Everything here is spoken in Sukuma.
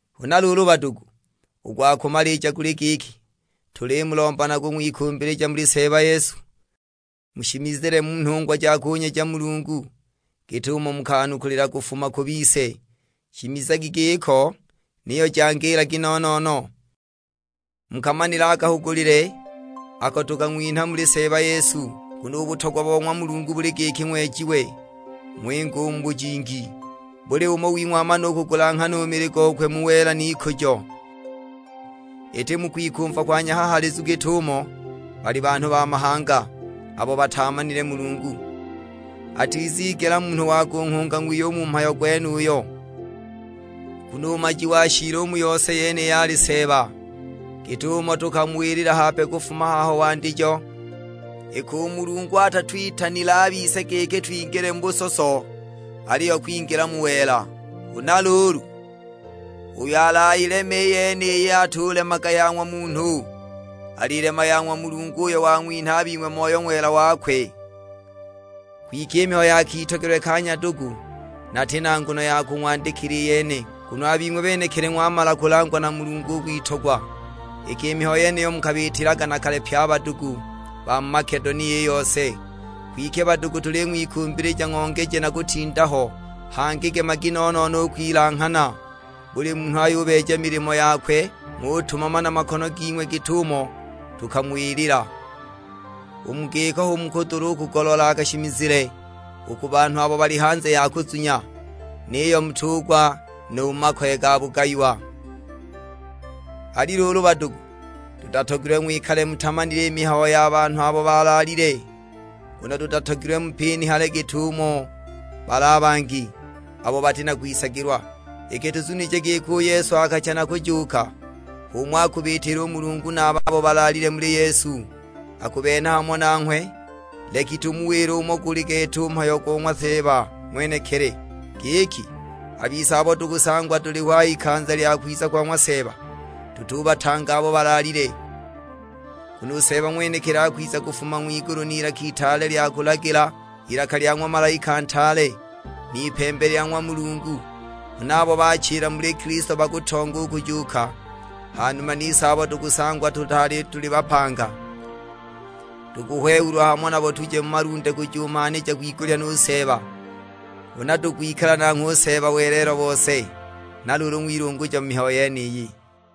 Huna luulu badugu, u gwa kumalija guli giki, tulimulomba na kung'wikumbilija muli Seeba Yesu, mushimizile mu nhungwa ja kunyeja Mulungu, git'umo mukanukulila kufuma ku bise. Shimizagi giko, niyo jangiilagi no-no-no. Mukamanile a kahugulile ako tukang'winha muli Seeba Yesu. Nguno u butogwa bo ng'wa Mulungu buli giki ng'wejiwe, ng'winge u mu bujingi. Buli umo wing'we amane u kugulanghana u mili gokwe mu wela n'ikujo. Iti mu kwikumva kwa nyahahaalizu git'umo bali banhu ba mahanga, abo bataamanile Mulungu. Atizigela munhu wa kunghunga ng'wiye u mu mhayo gwenuyo, nguno u maji wa shiili u mu yose yeniyi ali Seeba, git'umo tukamuwilila hape kufuma haho wandijo. Iki u Mulungu atatwitanile a bise giki twingile mu busoso, aliyo kwingila mu wela. Huna luulu uyo alayileme i yeniyi atulemaga ya ng'wa munhu, alilema ya ng'wa Mulungu uyo wang'winha a bing'we Moyo Ng'wela wakwe. Kwike i mihayo ya kitogelwe ka nyadugu, nati na nguno ya kung'wandikila i yene, nguno a bing'we benekili ng'wamala kulangwa na Mulungu u kwitogwa. Iki i mihayo yeniyo mukubiitilaga na kale pye a badugu ba mu Makedonia i yose; kwike badugu tuling'wikumbilija ng'ongeje na kutinda ho. Hangi gemagi no-no-no u kwilanghana, buli munhu ayubeeja milimo yakwe, ng'utumama na makono ging'we git'umo tukamuwilila. U mu giko hu mukudula kugoloola a kashimizile u ku banhu abo bali hanze ya kuzunya; niyo mutugwa nu mu makoye ga bugayiwa. Ali luulu badugu, tutatogilwe ng'wikale mutimanile i mihayo ya banhu abo balaalile, nguno tutatogilwe mupinihale git'umo bali a bangi, abo bati na kwisagilwa. Iki tuzunije giki u Yesu akacha na kujuuka, h'umo akubiitila u Mulungu na a babo balaalile muli Yesu, akubenha hamo nanghwe. Leki tumuwile umo guli gete u mhayo go ng'wa Seeba ng'wenekili; giki, a bise abo tukusangwa tuliho a h'ikanza lya kwiza kwa ng'wa Seeba, tutubatanga abo balaalile. Nguno u Seeba ng'wenekili akwiza kufuma ng'wigulu n'ilaka itaale lya kulagila, ilaka lya ng'wa malaika ntaale, n'ipembe lya ng'wa Mulungu; huna abo baachila muli Kilisto bakutonga u kujuuka. Ha numa nise abo tukusangwa tutaali tuli bapanga, tukuhwehulwa hamo nabo tuje mu malunde kujumanhija kwigulya nu Seeba. Huna tukwikala nanghwe u Seeba welelo bose. Na luulu ng'wilunguja mu mihayo yeniyi.